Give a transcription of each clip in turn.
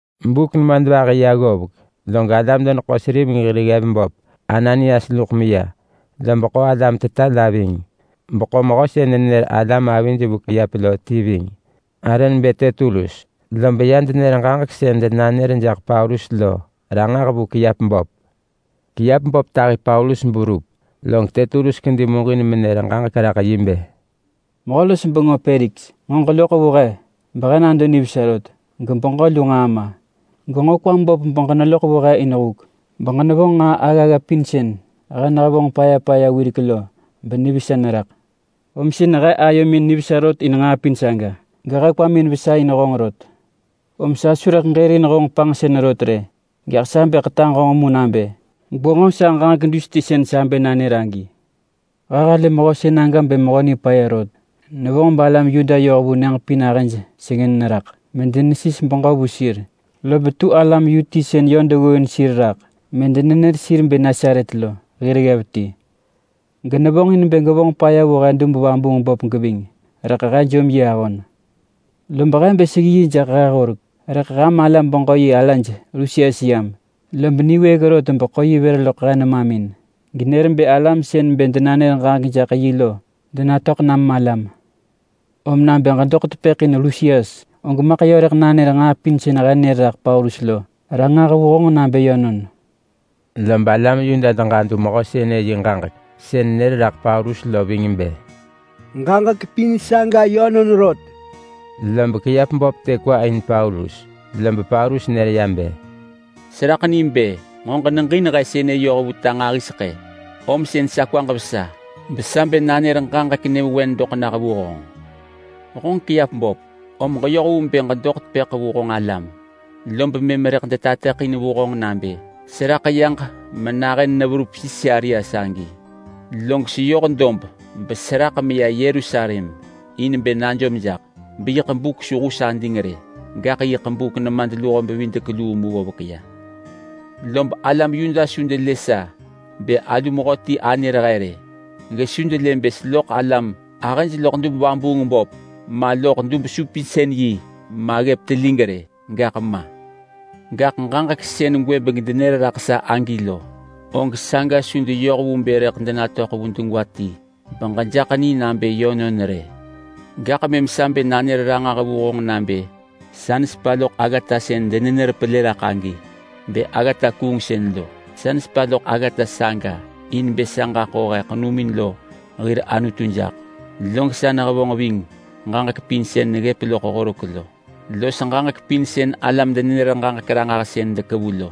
Buk nemadvahi ya ggovek ya, log alam-deneḳo-seriveng hir ggev böp Ananias luḳ meya, lob ḳo alam teta la ving, beḳo mehö sën nenër alam avij vu kiap lo ti ving, arë nebë Tertulus. Lob ya denër ġaġek sën denanër jaḳ Paulus lo ranġah vu kiap böp. Kiap böp tahi Paulus beverup, log Tertulus kedi muġin menër ġaġek raḳ yi bë, “Mehö los bengö Peliks! Nġo ġeloḳ vu he behe nado nivesa rot gebeġö lu nġaa ma. Genġo kwam böp beġeneloḳ vu he in huk beġenevonġ nġaa aggagga pin sën he nehevonġ paya paya wirek lo benivesa neraḳ. Om sën he ayomin nivesa rot in nġaa pin saga gehe kwamin vesa in honġ rot. Om sa su rëḳ aġërin honġ panġsën rot rë. Gaḳ sa bë ḳetaġ honġ mu nabë gwenġo sa ġaġek dus ti sën sa bë nanër agi. He halë mehö sënaga bë mehö nipaya rot. Nevonġ balam Yuda yoh vu nyëġ pin ahëj sengën neraḳ medenesis beġö vu sir. Lob tu alam yu ti sën yö deggooin sir raḳ medenenër sir nebë Nasaret lo hir ggev ti. Genevonġ in bë gevonġ paya vu he dub-vabuung-böp geving, rëḳ he jom yi ahon. [Lob he bë seggi yi jaḳ he horek, rëḳ ham alam-beġö-yi alaj Lusias yam, lob niwëëk rot beḳo yi vër loḳ he nemamin genër bë alam sën bë denanër ġaġek jaḳ yi lo denatöḳ nam malam.] Om nabë ġedoḳ tepëḳ in Lusias og maḳ yö rëḳ nanër nġaa pin sën he nër raḳ Paulus lo ranġah vu honġ nabë yönon!” Lob alam Yuda deġadu mehö sënë yi ġaġek sën nër raḳ Paulus lo ving bë, “Ġaġek pin saga yönon rot!” Lob kiap böp të kwa in Paulus, lob Paulus nër ya bë, “Seraḳ ni bë nġo ġeneġin he sënë yoh vu ta nġahiseḳë, om sën sa kwaġ vesa besa bë nanër ġaġek nyëvewen doḳ nah vu honġ. Honġ kiap böp, om ġeyoh vu bë ġedoḳ tepëḳ vu honġ alam, lob mëm rëḳ detateḳin vu honġ nabë seraḳ yaġ menahën neverup Sisarea sagi. Log seyoh dob beseraḳ meya Yerusalem in bë najom jaḳ beyiḳ buk su hus ading rë, gaḳ yiḳ buk nemadluho-bevidek-luu mu ggovek ya. Lob alam Yuda su delë sa bë alu mehöti anër he rë. Gesu delë bë seloḳ alam ahëj loḳ dub-vabuung-böp ma, loḳ dub-supinsën-yi ma, ggëp telig rë, gaḳ ma. Gaḳ ġaġek sën gwëbeng denër raḳ sa agi lo, og saga su deyoh vu bë rëḳ denatöḳ vu degwa ti beġejaḳ ni nabë yönon rë. Gaḳ mëm sa bë nanër ranġah vu honġ nabë sa nesepa loḳ aggata sën denenër pelë raḳ agi bë aggata kuungsën lo. Sa nesepa loḳ aggata saga in bë sa ġaḳo he ḳenumin lo hir Anutu jaḳ. Log sa nehevonġ ving ġaġek pin sën neggëp loḳ horek lo los ġaġek pin sën alam-denenër-ġaġek-ranġahsën dekevu lo.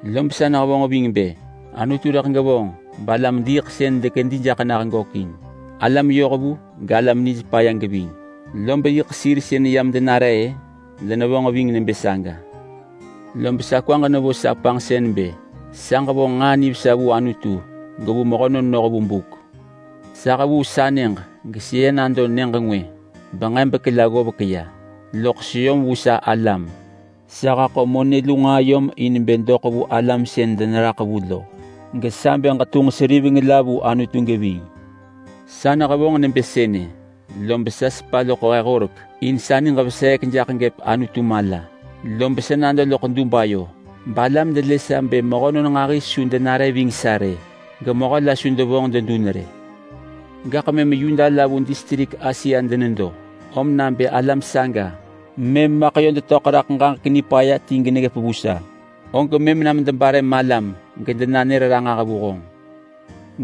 Lob sa nehevonġ ving bë Anutu rëḳ gevonġ balam-diiḳsën dekedi jaḳ nah gökin, alam yohvu galam nij paya geving. Lob yiḳ sir sën yam denare-ë, denevonġ ving nebë saga. Lob sa kwaġ nevo sa panġsën bë sa ġevonġ nġaa nivesa vu Anutu gevu mehönon noh vu buk. Sa hevuu sa nyëġ geseya nado nyëġ ngwë benġebek la ggovek ya loḳ seyom vu sa alam. Sa haḳo monë lu nġaa yom in bë doḳ vu alam sën deneraḳ vu in lo, gesa bë ġetunġ seriveng la vu Anutu geving. Sa nehevonġ nebë sënë, lob sa sepa loḳ he horek in sa niġ veseek jaḳ gëp Anutu mala. Lob sa nado loḳ dub ayo balam delë sa bë mehönon nġahi su denare ving sa rë, gemehö la su devonġ dedun rë. Gaḳ mëm Yuda la vu distrik Asia denedo, om nabë alam saga mëm maḳ yö detöḳ raḳ ġaġek nipaya ti geneggëp vu sa, og mëm nam debare malam gedenanër ranġah vu honġ.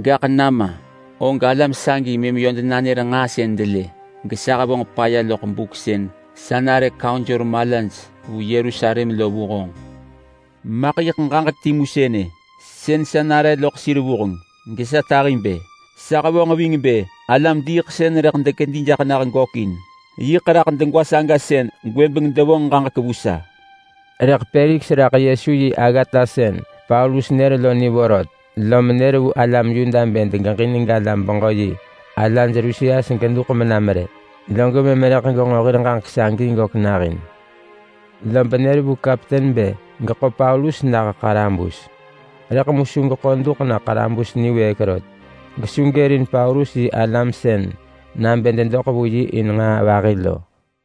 Gaḳ nama, om alam sagi mëm yö denanër nġaa sën delë gesa hevonġ paya loḳ buk sën sa nare kaunsor malaj vu Yerusalem lo vu honġ. Maḳ yiḳ ġaġek timu sënë, sën sa nare loḳ sir vuheng gesa tahi bë, ‘Sa hevonġ ving bë alam-diiḳsën rëḳ dekedi jaḳ nah gökin.’ Yiḳ raḳ degwa saga sën gwëbeng devonġ ġaġek vu sa.” Rëḳ mu Peliks raḳ Yesu yi aggata sën Paulus nër lo ni vorot, lom nër vu alam Yuda bë degeġin galam-beġö-yi alaj Lusias duḳ menam rë, log mëm rëḳ genġo hir ġaġek sagi gök nahin. Lob nër vu kapten bë geḳo Paulus nah ḳarabus, rëḳ mu su geḳo duḳ na ḳarabus niwëëk rot. Gesu gërin Paulus yi alam sën nabë dedoḳ vu yi in nġaa vahi lo.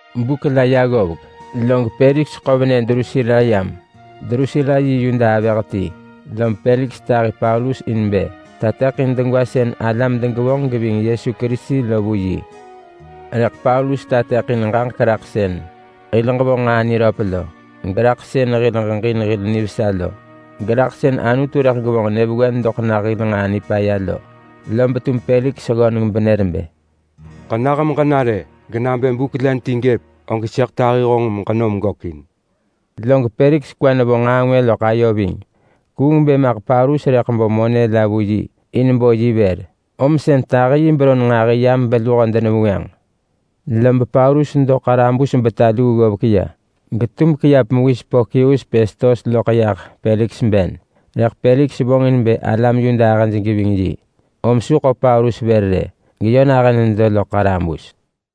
Buk la ya ggovek log Peliks ḳo venë Drusila yam. Drusila yi Yuda avëh ti. Lob Peliks tahi Paulus in bë tateḳin degwa sën alam degevonġ geving Yesu Kerisi lo vu yi. Rëḳ Paulus tateḳin ġaġek raḳ sën hil ġevonġ nġaa niröp lo, geraḳ sën hil ġeġin hil nivesa lo, geraḳ sën Anutu rëḳ gevonġ nyëvewen doḳ nah hil nġaa nipaya lo. Lob tum Peliks ggöneng benër bë, “Ġenah meġena rë! Genabë buk len ti gëp og sëḳ tahi honġ meġenom gökin.” Log Peliks kwa nevo nġaa ngwë loḳ ayo ving. Kuung bë maḳ Paulus rëḳ bo monë la vu yi in bo yi vër, om sën tahi yi beron nġahi yam beluho denevengwënġ. Lob Paulus nedo ḳarabus beta luu ggovek ya getum kiap mewis Porkius Pestos loḳ yah Peliks ben. Rëḳ Peliks vonġ in bë alam Yuda ahëj geving yi om su ḳo Paulus vër rë geyö nahën nedo loḳ ḳarabus.